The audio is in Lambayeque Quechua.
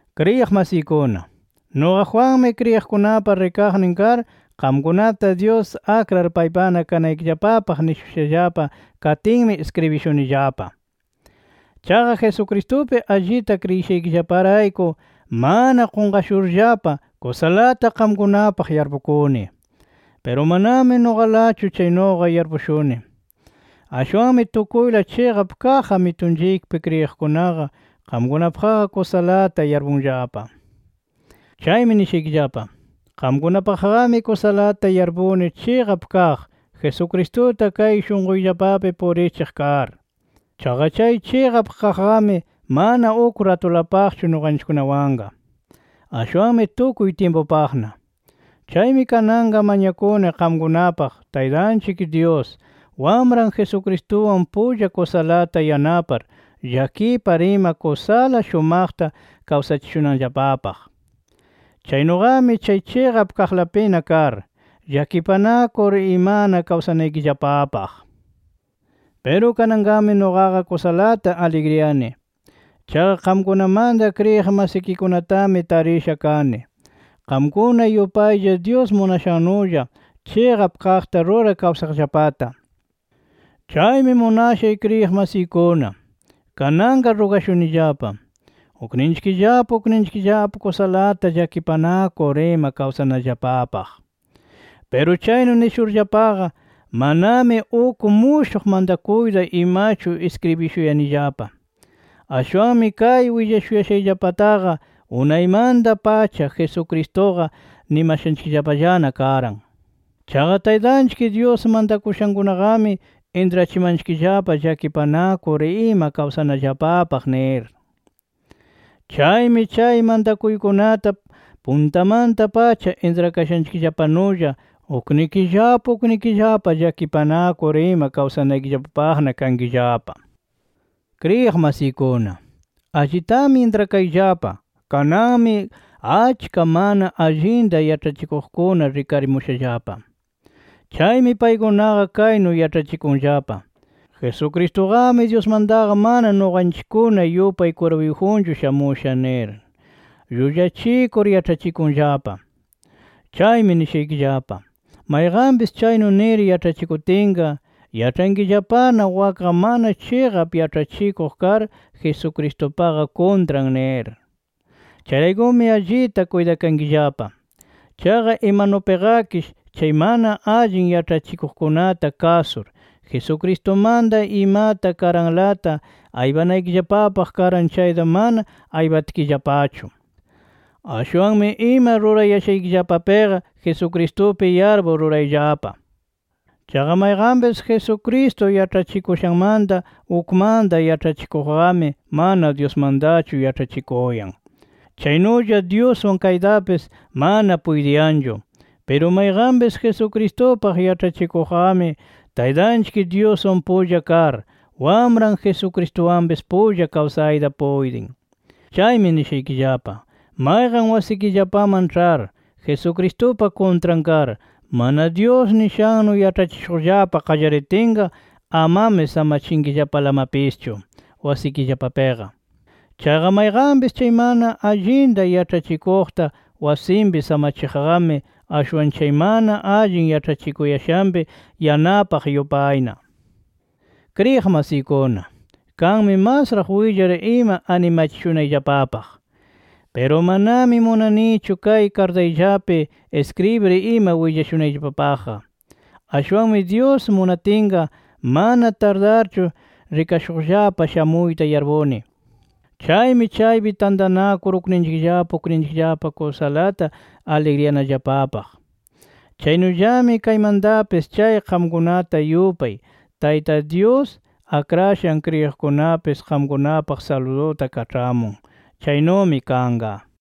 Kriyiq masiykuna, nuqa Juanmi kriyiqkunapa rikaqnin kar, qamkunata Dyus akrar paypana kanaykillapapaq nishushallapa katinmi iskribishunillapa. Chaqa Jesucristupi allita kriyishaykillaparayku mana qunqashurllapa, kusalata qamkunapaq yarpukuni. Piru manami nuqalachu chaynuqa yarpushuni, ashwanmi tukuyla chiqap kaq Amitunchikpi kriyiqkunaqa qamkunapaqqa kusalata yarpunllapa. Chaymi nishaykillapa: Qamkunapaqqami kusalata yarpuni chiqap kaq, Jesucristuta kay shunquyllapapi purichiq kar. Chaqa chay chiqap kaqqami, mana uk ratulapaqchu nuqanchikkunawanqa, ashwanmi tukuy tyimpupaqna. Chaymi kananqa mañakuni qamkunapaq Taytanchik Dyus, Wamran Jesucristuwan pulla kusalata yanapar, llakipar ima kusala shumaqta kawsachishunanllapapaq. Chaynuqami chay chiqap kaqlapina kar, llakipanakur imana kawsanaykillapapaq. Piru kananqami nuqaqa kusalata aligriyani. Chaqa qamkunamanta kriyiq masikikunatami tarisha kani, qamkuna yupaylla Dyus munashannulla, chiqap kaqta rurar kawsaqllapata. Chaymi munashay kriyiq masiykuna, kananqa rugashunillapa ukninchikllapa ukninchikllapa kusalata llakipanakur ima kawsanallapapaq. Piru kaynu nishurllapaqa, manami uk mushuq mantakuyta imachu iskribishuyanillapa. Ashwanmi kay willashuyashayllapataqa unaymanta-pacha Jesucristuqa nimashanchikllapallana karan. Chaqa Taytanchik Dyus mantakushankunaqami intrachimanchikllapa llakipanakur ima kawsanallapapaq nir. Chaymi chay mantakuykunata puntamanta-pacha intrakashaykillapanulla uknikillapa uknikillapa llakipanakur ima kawsanaykillapapaqna kankillapa. Kriyiq masiykuna, allitami intrakayllapa, kananmi achka mana allinta yaĉhachikuqkuna rikarimushallapa. Chaymi paykunaqa kaynu yaĉhachikunllapa: “Jesucristuqami Dyusmantaqa mana nuqanchikkuna yupay kwirpuyjunchu shamusha” nir llullachikur yaĉhachikunllapa. Chaymi nishaykillapa: Mayqanpis chaynu nir yaĉhachikutinqa yaĉhankillapana wakqa mana chiqap yaĉhachikuq kar Jesucristupaqa kuntran nir. Chayraykumi allita kuytakankillapa. Chaqa imanupiqakish chay mana allin yaĉhachikuqkunata kasur, Jesucristumanta imata karanlata aypanaykillapapaq karan chayta mana aypatkillapachu. Ashwanmi ima rurayashaykillapapiqa Jesucristupi yarpur rurayllapa. Chaqa mayqanpis Jesucristo yaĉhachikushanmanta ukmanta yaĉhachikuqqami mana Dyusmantachu yaĉhachikuyan, chaynulla Dyuswan kaytapis mana puytiyanchu. Piru mayqanpis Jesucristupaq yaĉhachikuqqami, Taytanchik Dyuswan pulla kar, Wamran Jesucristuwanpis pulla kawsayta puytin. Chaymi nishaykillapa: Mayqan wasikillapaman ĉhar Jesucristupa kuntran kar, mana Dyus nishannu yaĉhachishuqllapa qallaritinqa amami samachinkillapalamapischu wasikillapapiqa. Chaqa mayqanpis chay mana allinta yaĉhachikuqta wasinpi samachiqqami, ashwan chay mana allin yaĉhachikuyashanpi yanapaq yupayna. Kriyiq masiykuna, kanmi masraq willar ima animachishunayllapapaq. Piru manami munanichu kay kartayllapi iskribir ima willashunayllapapaqqa. Ashwanmi Dyus munatinqa mana tardarchu rikashuqllapa shamuyta yarpuni. Chaymi chaypi tantanakur ukninchikllapa ukninchikllapa kusalata aligriyanallapapaq. Chaynullami kaymantapis chay qamkunata yupay, Tayta Dyus akrashan kriyiqkunapis, qamkunapaq saluduta kaĉhamun. Chaynumi kanqa.